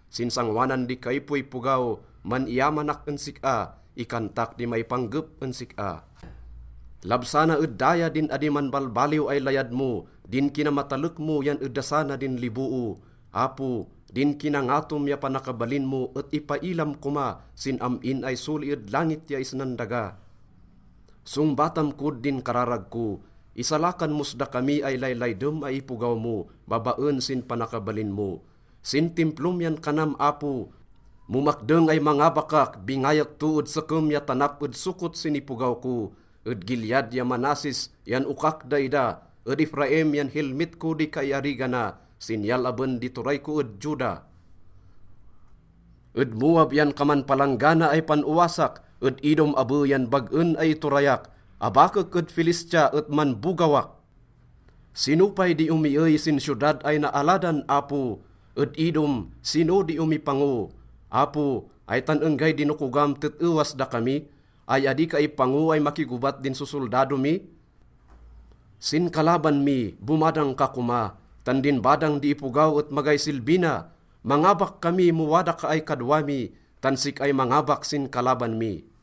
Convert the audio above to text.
Sin sangoanan di kaipoipogaw, man-iyamanak en sik-a, ikantak di maipanggep en sik-a. Labsana ed daya din adi manbalbaliw ay layad mo, din kinamatalek mo yan edasana din liboo. Apo, din kinangatom ya panakabalin mo et ipailam koma sin am-in ay soli ed langit ya isnan daga. Songbatam kod din kararag ko, isalakan mos dakami ay laylaydem ay ipogaw mo babaen sin panakabalin mo. Sin Timplom yan kanam, Apo, “Mo makdeng ay mangabakak, bingayek to ed Sekem ya tanap ed Succot sin ipogaw ko. Ed Gilead ya Manasses yan okak daida, ed Efraim yan helmet ko di kaiarigana, sinyal aben di turay ko ed Juda. Ed Moab yan kaman palanggana ay pan-owasak, ed Edom abe yan bag-en ay iturayak. Abakek ed Filistia et manbogawak.” Sino pay di omiey sin siyodad ay naaladan, Apo? Ed Edom, sino di omipango? Apo, ay tan enggay dinokogam tet-ewas dakami? Ay adi ka ipango ay makigobat din sosoldado mi? Sin kalaban mi, bomadang ka koma, tan din badang di ipogaw et magay silbi na. Mangabak kami mo wada ka ay kadwa mi, tan sik-ay mangabak sin kalaban mi.